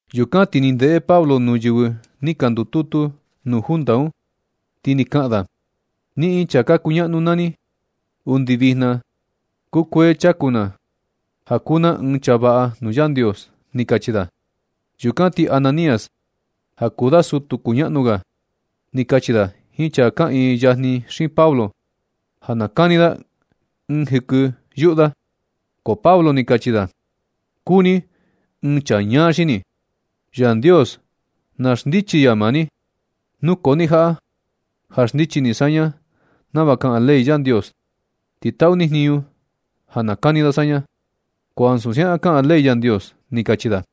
Yukan ti ni ndeꞌe Pablo nuu yɨvɨ ni ka ndututu nuu junta un, ti ni kaꞌan da: ―Niꞌin chaa ka kuñaꞌnu naa ni, undi vijna kukuee chaku na, ja kuu na ɨɨn chaa vaꞌa nuu Yandios ―ni kachi da. Yukan ti Ananías, ja kuu da sutu kuñaꞌnu ga, ni kachi da jiin chaa kaꞌiin yajni xiin Pablo ja na kani da ɨɨn jikɨ yuꞌu da. Ko Pablo ni kachi da: ―Kuu ni ɨɨn chaa ñaa xini. Yandios na xndichi ya maa ni. Nukoo ni jaꞌa ja xndichi ni saña nava kaꞌan ley Yandios. Ni taꞌu ni jniñu ja na kani da saña, ko ansu siaꞌan kaꞌan ley Yandios ―ni kachi da.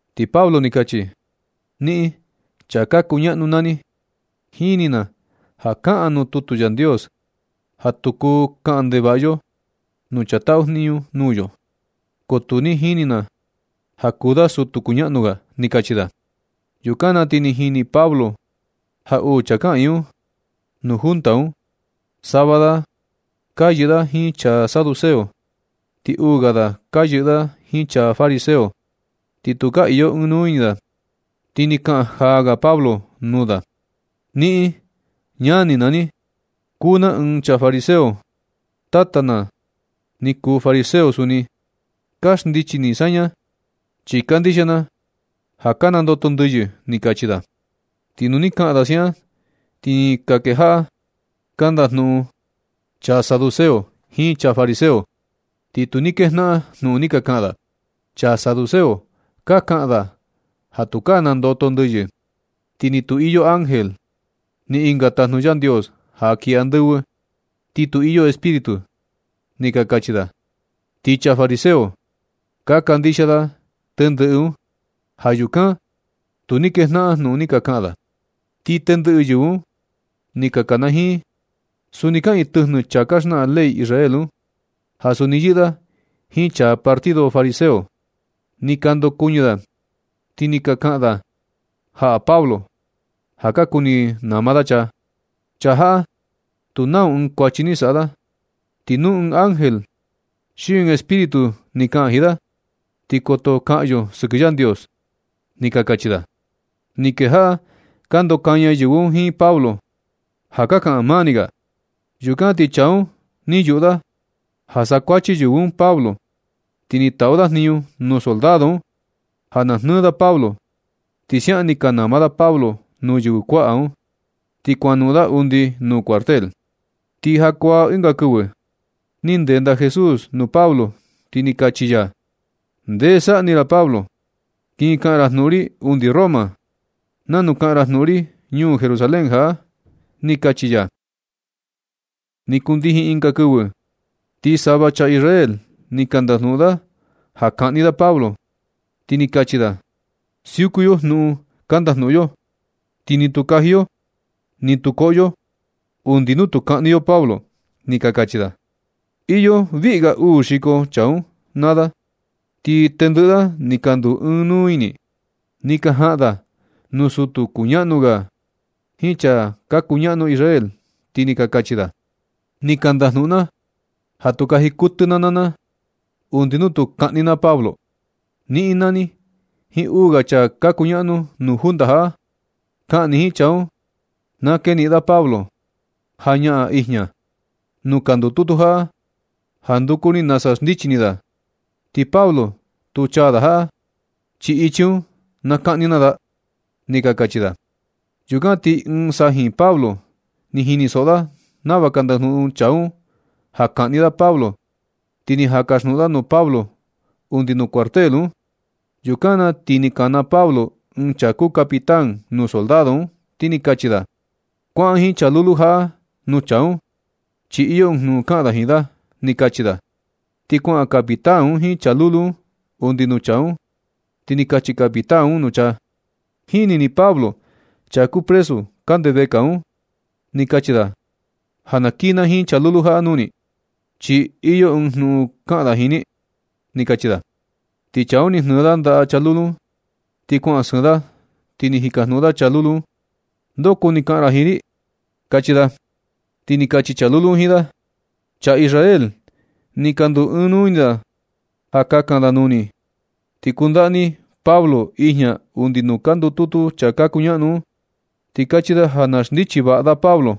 Ti Pablo ni kachi: ―Niꞌin chaa ka kuñaꞌnu naa ni, jini na ja kaꞌan nuu tutu Yandios ja tu kuu kaꞌan ndevaꞌa yo nuu chaa taꞌu jniñu nuu yo, ko tu ni jini na ja kuu da sutu kuñaꞌnu ga ―ni kachi da. Yukan na ti ni jini Pablo ja uu chaa kaꞌiin nuu junta un, sava da ka yɨꞌɨ da jiin chaa saduceo, ti uu ga da ka yɨꞌɨ da jiin chaa fariseo, ti tu ka iyo ɨɨn nuu ini da. Ti ni kaꞌan jaa ga Pablo nuu da: ―¡Niꞌin ñani naa ni, kuu na ɨɨn chaa fariseo! Tata na ni kuu fariseo suni. Ka xndichi ni saña, chi kandixia na ja ka nandoto ndɨyɨ ―ni kachi da. Ti nu ni kaꞌan da siaꞌan, ti ni ka kejaꞌa ka ndajnuꞌun chaa saduceo jiin chaa fariseo, ti tu ni kejnaꞌan jnuꞌun ni ka kaꞌan da. Chaa saduceo ka kaꞌan da ja tu ka nandoto ndɨyɨ, ti ni tu iyo ángel, ni ɨnga tajnu Yandios ja kii andɨvɨ, ni tu iyo espíritu, ni ka kachi da. Ti chaa fariseo, ka kandixia da tendɨꞌɨ un. Ja yukan tu ni kejnaꞌan jnuꞌun ni ka kaꞌan da. Ti tendɨꞌɨ yɨvɨ un ni ka kanajiin. Suni kaꞌiin tɨjnɨ chaa ka xnaꞌan ley Israel ja suni yɨꞌɨ da jiin chaa partido fariseo. Ni ka ndokuɨñɨ da ti ni ka kaꞌan da jaꞌa Pablo ja ka kuni nama da chaa: ―Chaa jaꞌa tu nau ɨɨn kuachi ni saꞌa da, ti nu ɨɨn ángel xi ɨɨn espíritu ni kaꞌan jiin da, ti koto kaꞌan yo sɨkɨ Yandios ―ni ka kachi da. Ni kejaꞌa ka ndokaña yɨvɨ un jiin Pablo ja ka kaꞌan maa ni ga. Yukan ti chaa un ni yuꞌu da ja sakuachi yɨvɨ un Pablo, ti ni taꞌu da jniñu nuu soldado un ja na jnɨɨ da Pablo. Ti siaꞌan ni ka nama da Pablo nuu yɨvɨ kuaꞌa un, ti kuanoꞌon da undi nuu cuartel. Ti jakuaa ɨnga kɨvɨ, ni ndenda Jesús nuu Pablo, ti ni kachi ya: ―Ndee saꞌa ini ra Pablo. Kin kaꞌan ra jnuꞌun ri undi Roma, nanu kaꞌan ra jnuꞌun ri ñuu Jerusalén jaꞌa ―ni kachi ya. Ni kundijin ɨnga kɨvɨ, ti sava chaa Israel ni ka ndajnuꞌun da ja kaꞌni da Pablo, ti ni kachi da: ―Siuku yo jnuꞌun ka ndajnuꞌun yo. Ti ni tu kaji yo, ni tu koꞌo yo undi nu tu kaꞌni yo Pablo ―ni ka kachi da. Iyo viꞌi ga uu xiko chaa un naa da, ti tendɨꞌɨ da ni ka ndu ɨɨn nuu ini. Ni ka jaꞌan da nuu sutu kuñaꞌnu ga jiin chaa ka kuñaꞌnu Israel, ti ni ka kachi da: ―Ni ka ndajnuꞌun na ja tu kaji kuɨtɨ na naa na undi nu tu kaꞌni na Pablo. Niꞌin naa ni jiin uu ga chaa ka kuñaꞌnu nuu junta jaꞌa, kaꞌan ni jiin chaa un na keniꞌin da Pablo jañaꞌan ijña nuu ka ndututu jaꞌa, ja nduku ni nasa xndichi ni da. Ti Pablo tu chaa da jaꞌa, chi ichi un na kaꞌni na da ―ni ka kachi da. Yukan ti ɨɨn sajin Pablo ni jinisoꞌo da nava ka ndajnuꞌun chaa un ja kaꞌni da Pablo, ti ni jan kasjnuꞌun da nuu Pablo undi nuu cuartel un. Yukan na ti ni kana Pablo ɨɨn chaa kuu capitán nuu soldado un, ti ni kachi da: ―Kuaꞌan jiin chaa lulu jaꞌa nuu chaa un, chi iyo ɨɨn jnuꞌun kaꞌan da jiin da ―ni kachi da. Ti kuaꞌan capitán un jiin chaa lulu un undi nuu chaa un, ti ni kachi capitán un nuu chaa: ―Jini ni Pablo, chaa kuu presu kande vekaa un, ni kachi da ja na kii na jiin chaa lulu jaꞌa nuu ni, chi iyo ɨɨn jnuꞌun kaꞌan da jiin ni ―ni kachi da. Ti chaa un ni jnɨɨ da ndaꞌa chaa lulu un, ti kuaꞌan sɨɨn da, ti ni jikajnuꞌun da chaa lulu un: ―¿Ndoo kuni kaꞌan ra jiin ri? ―kachi da. Ti ni kachi chaa lulu un jiin da: ―Chaa Israel, ni ka ndu ɨɨn nuu ini da ja kakan da nuu ni, ti kundaꞌa ni Pablo ijña undi nuu ka ndututu chaa ka kuñaꞌnu un. Ti kachi da ja na xndichi vaꞌa da Pablo,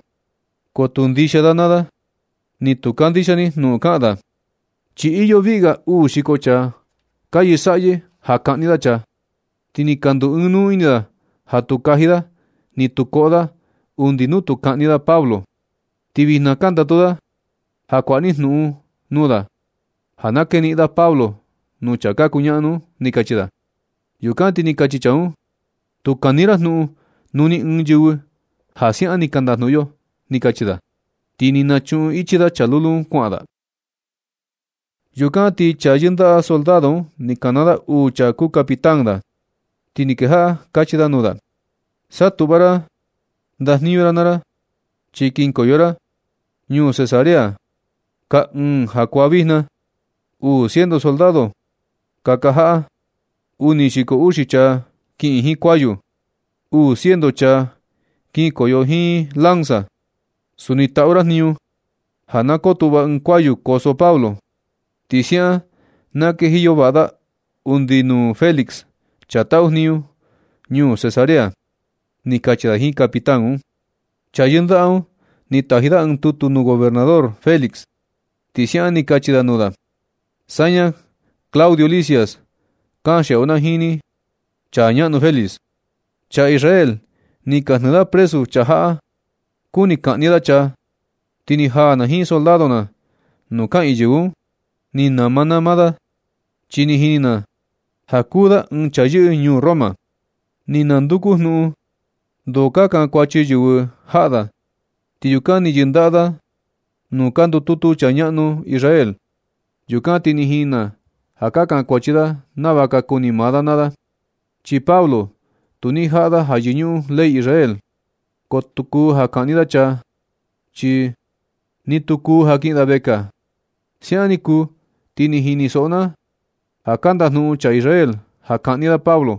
ko tu ndixia da naa da. Ti tu kandixia ni jnuꞌun kaꞌan da, chi iyo viꞌi ga uu xiko chaa ka yɨsaꞌyɨ ja kaꞌni da chaa. Ti ni ka ndu ɨɨn nuu ini da ja tu kaji da, ni tu koꞌo da undi nu tu kaꞌni da Pablo. Ti vijna ka ndatu da ja kuaꞌa ni jnuꞌun nuu da ja na keniꞌin ni Pablo nuu chaa ka kuñaꞌnu un ―ni kachi da. Yukan ti ni kachi chaa un: ―Tu kani ra jnuꞌun nuu ni ɨɨn yɨvɨ ja siaꞌan ni ka ndajnuꞌun yo ―ni kachi da. Ti ni na chuꞌun ichi da chaa lulu un kuaꞌan da. Yukan na ti chaa yɨndaꞌa soldado un ni kana da uu chaa kuu capitán da, ti ni kejaꞌa kachi da nuu da: ―Satuꞌva ra ndajniñu ra naa ra, chi kinkoꞌo ra ñuu Cesarea kaa ɨɨn jakuaa vijna. Uu ciento soldado kaka jaꞌa. Uni xiko uxi chaa kiꞌin jiin kuayu. Uu ciento chaa kinkoyo jiin lanza. Suni taꞌu ra jniñu ja na kotuꞌva ɨɨn kuayu koso Pablo. Ti siaꞌan na kejiyo vaꞌa da undi nuu Félix, chaa taꞌu jniñu ñuu Cesarea ―ni kachi da jiin capitán un. Chaa yɨndaꞌa un ni taji da ɨɨn tutu nuu gobernador Félix, ti siaꞌan ni kachi da nuu da: “Saña, Claudio Lisias, kanxiaꞌu na jiin niꞌin, chaa ñaꞌnu Félix. Chaa Israel, ni ka jnɨɨ da presu chaa jaꞌa. Kuni kaꞌni da chaa, ti ni jaa na jiin soldado na nuu kaꞌiin yɨvɨ un. Ni nama na da, chi ni jini na ja kuu da ɨɨn chaa yɨꞌɨ ñuu Roma. Ni nanduku jnuꞌun ndoo ka kankuachi yɨvɨ jaꞌa da. Ti yukan ni yɨndaꞌa na da nuu ka ndututu chaa ñaꞌnu Israel. Yukan ti ni jini na ja ka kankuachi da nava ka kuni maa da naa da, chi Pablo tu ni jaꞌa da ja yɨñuꞌun ley Israel. Ko tu kuu ja kaꞌni da chaa, ni tu kuu ja kiꞌin da vekaa. Siaꞌan ni kuu ti ni jinisoꞌo na ja ka ndajnuꞌun chaa Israel ja kaꞌni da Pablo.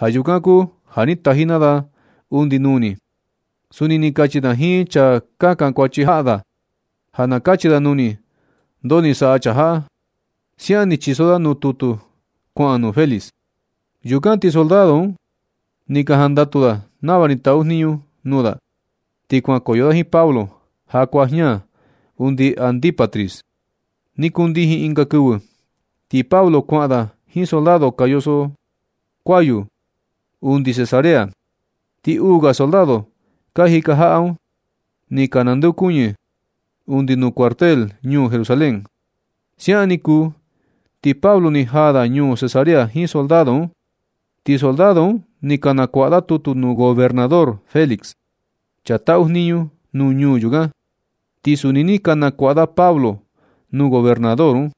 Ja yukan kuu ja ni taji na da undi nuu ni. Suni ni kachi na jiin chaa ka kankuachi jaꞌa da ja na kachi da nuu ni nu ndoo ni saꞌa chaa jaꞌa.” Siaꞌan ni chiso da nuu tutu kuaꞌan nuu Félix. Yukan ti soldado un, ni ka jandatu da nava ni taꞌu jniñu nuu da, ti kuankoyo da jiin Pablo jakuaa jña undi Antípatris. Ni kundijin ɨnga kɨvɨ, ti Pablo kuaꞌan da jiin soldado ka yoso da kuayu un undi Cesarea, ti uu ga soldado ka jika jaꞌa un ni ka nandeokuñɨ undi nuu cuartel ñuu Jerusalén. Siaꞌan ni kuu, ti Pablo ni jaa da ñuu Cesarea jiin soldado un, ti soldado un ni ka nakuaꞌa da tutu nuu gobernador Félix, chaa taꞌu jniñu nuu ñuu yukan. Ti suni ni ka nakuaꞌa da Pablo nuu gobernador un.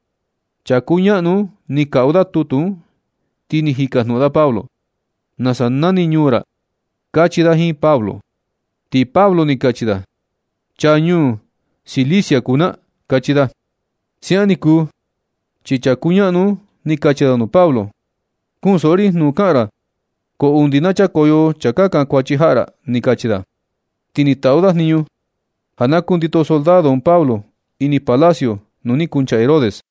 Chaa kuñaꞌnu un ni kaꞌu da tutu un, ti ni jikajnuꞌun da Pablo: ―¿Nasa nani ñuu ra? ―kachi da jiin Pablo. Ti Pablo ni kachi da: ―Chaa ñuu Cilicia kuu na ―kachi da. Siaꞌan ni kuu, ti chaa kuñaꞌnu un ni kachi da nuu Pablo: ―Kunsoꞌo ri jnuꞌun kaꞌan ra, ko undi na chakoyo chaa ka kankuachi jaꞌa ra ―ni kachi da. Ti ni taꞌu da jniñu ja na kundito soldado un Pablo ini palacio nuu ni kuncha Herodes.